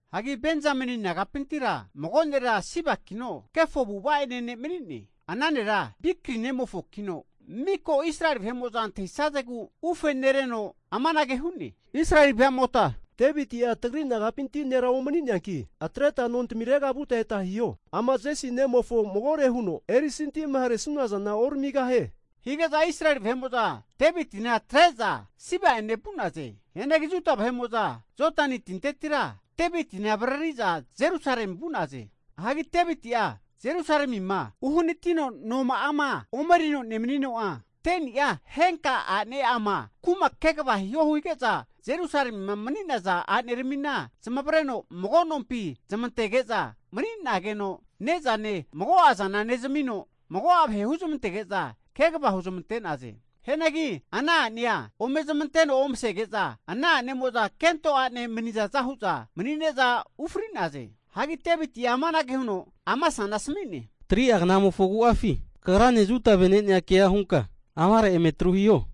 Hagi Benzameni nagapintira mago nera Sibakino, kefo avu'ava'ene ne' mani'ne. Ana nera Bikri nemofokino miko Israeli vahe'mo'za antahisazegu ufe nereno amanage hu'ne, Israeli veamota, Deviti'a tagri nagapinti nera omani'neanki, atreta nontamirega vuta eta hiho. Ama Jesi nemofo'a magore huno erisantima haresuna zana ontamigahie. Hige'za Israeli vahe'mo'za Devitina atre'za Siba'ene vu'naze. Hianagi Juda vahe'mo'za Jodani tintetira Devitina avariri'za Jerusalemi vu'naze. Hagi Deviti'a Jerusalemima uhanatino noma'ama ome enerino nemanino'a, 10ni'a henka a'nema'ama kuma kegava hiho hige'za Jerusalemima mani'naza a'neramina zamavareno mago nompi zamantege'za mani'nageno ne'zane mago'azana nezamino mago'a vahe huzmanteg'za kegava huzmante'naze. Hianagi ana a'nea ome zamanteno omasege'za, ana a'nemo'za kento ane manizaza hu'za mani'ne'za ufri'naze. Hagi Deviti'a amanage huno Amasana asmi'ne, 3'a knamofo agu'afi kagrane Juda vene'nea ke hunka amare eme atru hiho!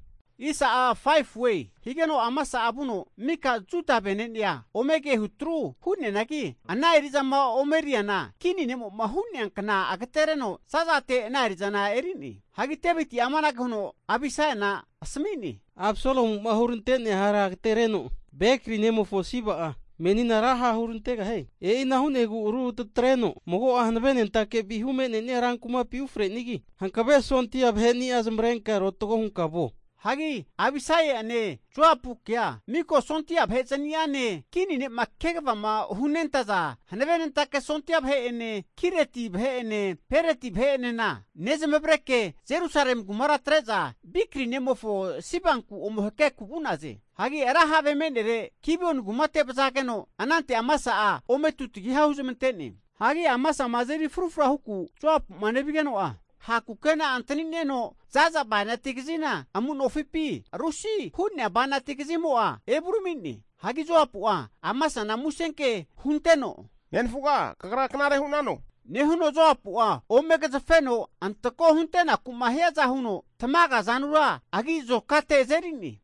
Higeno Amasa'a vuno mika Juda vene'nea ome kehu atru hu'neanagi, ana eri'zama ome eriana kini ne'mo'ma hu'nea kna agatereno za'zate ana eri'zana eri'ne. Hagi Deviti'a amanage huno Abisaiana asmi'ne, Absalomu'ma hurante'nea hara agatereno Bekri nemofo Siba'a menina ra ha' hurantegahie. E'ina hu'negu ru tatreno mago'a hanavenentake vihu me'ne'nia rankumapi ufre'nigi, hankave sondia vaheni'a zamavarenka arotago hunka vuo. Hagi Abisaia'ene Joapukea mika sondia vahe'zniane, kini ne'ma kegavama hunentaza hanavenentake sondia vahe'ene Kireti vahe'ene Peliti vahe'enena nezamavareke, Jerusalemi kumara atre'za Bikri nemofo Sibanku ome hakeku vu'naze. Hagi ra have me'nere Gibioni kumate vazageno, anante Amasa'a ome tutagiha' huzamante'ne. Hagi Amasama azeri frufra hunaku Joapuma nevigeno'a, ha' kukena atanineno zaza bainati kazina amu nofipi rusi hu'nea bainati kazimo'a evurami'ne. Hagi Joapu'a Amasana musenke hunteno, nenafuga kagra knare hu'nano? Nehuno Joapu'a ome agazafeno antako hunte'naku'ma hiaza huno tamaga azanura agi' azokate azeri'ne.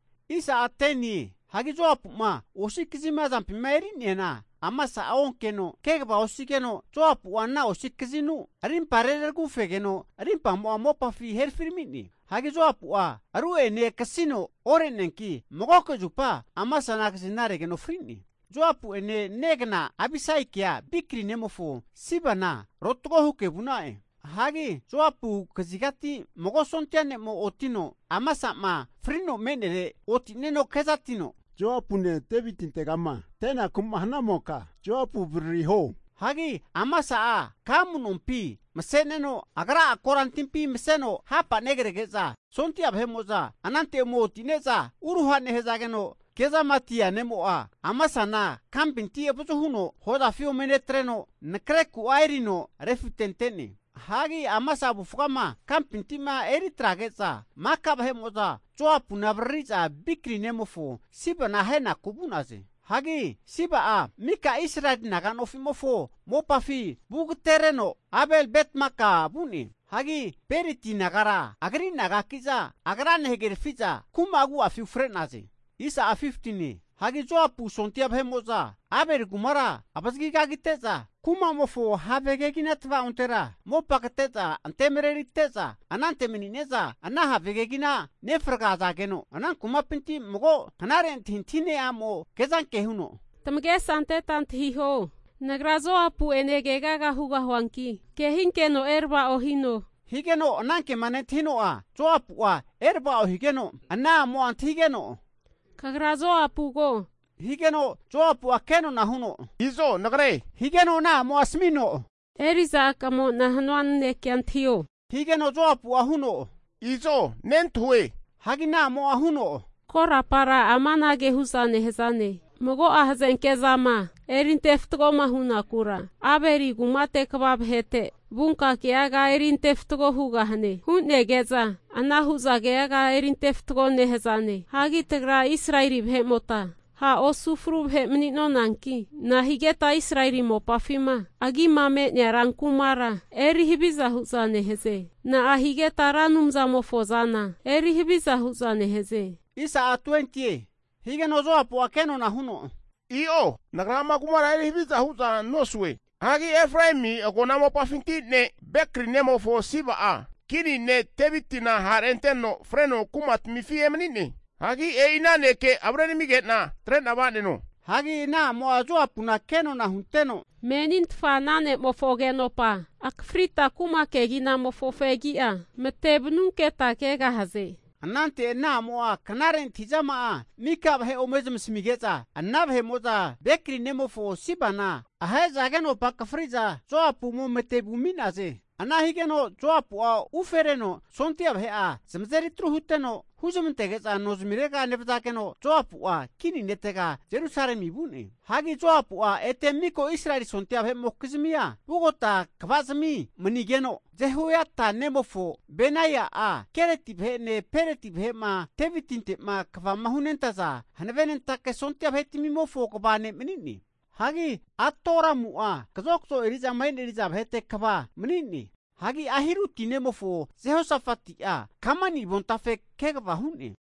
Hagi Joapu'ma osi kazima azampima eri'neana Amasa'a onkeno, kegava osigeno Joapu'a ana osi kazinu rimpa reraragufegeno rimpamo'a mopafi herafirami'ne. Hagi Joapu'a ru'enena akasino ore'neanki, magoke zupa Amasana kazina regeno fri'ne. Joapu'ene negna Abisaikea Bikri nemofo Sibana rotago huke vu'na'e. Hagi Joapu kazigati mago sondia ne'mo otino, Amasa'ma frino me'nere oti'neno kezatino, Joapune Devitintegama ante'naku'ma hanamoka Joapu avaririo. Hagi Amasa'a ka amu'nompi mase'neno, agra'a kora timpi maseno hapa nerege'za, sondia vahe'mo'za, anante eme oti'ne'za uruha nehazageno, kezamatia ne'mo'a Amasana kampinti avazu huno hozafi ome netreno, nakare ku erino refitente'ne. Hagi Amasa avufgama kampinti'ma eri atrege'za, maka vahe'mo'za Joapuna avariri'za Bikri nemofo Sibana ahenaku vu'naze. Hagi Siba'a mika Israeli naga nofi'mofo mopafi vugatereno, Abel-Betmaka vu'ne. Hagi Beriti nagara agri nagaki'za agrane hagerafi'za kuma agu'a ufre'naze. Hagi Joapu sondia vahe'mo'za Abeli kumara avazagi kagite'za, kumamofo have kegina tavaontera mopa kate'za ante marerite'za, anante mani'ne'za ana have kegina nefragazageno, ana kumapinti mago knare antahintahine a'mo kezanke huno, Tamagesa anteta antahiho, nagra Joapu'ene keaga hugahuanki kehinkeno erava'o hino. Higeno ana kema nentahino, Joapu'ma erava'o higeno, ana amo antahigeno, Kagra Joapugo higeno Joapu'a kenona huno, Izo nagre. Higeno ana a'mo'a asamino, eri'za a'kamo'na hanua nanekea antahio, higeno Joapu'a huno, Izo nentahue. Hagi ana a'mo huno, Korapara amanage hu'za nehazane, mago'a hazanke'zama eri antefatgoma hunakura, Abeli kumate kva vahete vunka keaga eri antefatgo hugahane hunege'za ana hu'za keaga erinte fatgo nehazane. Hagi tagra Israeli vahe'mota ha' osu fru vahe mani'nonanki, nahigeta Israeli mopafima agima me'nea rankumara eri haviza hu'za nehaze. Na'a higeta Ra Anumzamofo zana eri haviza hu'za nehaze? Higeno Joapu'a kenona huno, I'o, nagra ama kumara eri haviza hu'za nosue. Hagi Efraemi agona mopafinti ne' Bekri nemofo Siba'a kini ne' Devitina ha'renteteno freno kumatamifi emani'ne. Hagi e'ina neke avrenamige'na atre'na va'neno. Hagi ana a'mo Joapuna kenona hunteno, Menintfa ana ne'mofo agenopa akafrita kuma keginamofo fegi'a mate vanunketa kegahaze. Anante ana a'mo'a knare antahizama'a mika vahe ome zamasamige'za, ana vahe'mo'za Bekri nemofo Sibana ahe'za agenopa'a akafri'za Joapu ome mate vumi'naze. Ana higeno Joapua ufereno sondia vahe'a zamazeri atru huteno huzmantege'za nozmirega nevazageno, Joapu'a kini netega Jerusalemi vu'ne. Hagi Joapu'a ete mika Israeli sondia vahe'mokizmia vugote kvazimi manigeno, Jehoiata nemofo Benaia'a, Kereti vahe'ene Peleti vahe'ma Devitinte'ma kva hunentaza hanavenentake sondia vahe'tamimofo kva ne' mani'ne. Hagi Atoramu'a kazokzo eri'zama e'neri'za vahete kva mani'ne. Hagi Ahiruti nemofo Jehosafati'a kamani avontafe kegava hu'ne.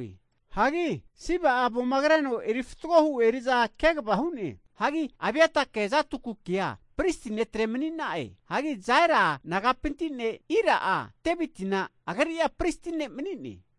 Hagi Siba'a avoma kreno eri fatgo hu eri'za kegava hu'ne. Hagi Abiatake Zadokukea pristi netre mani'na'e. Hagi Jaira nagapinti ne Ira'a, Devitina agri'a pristi ne' mani'ne.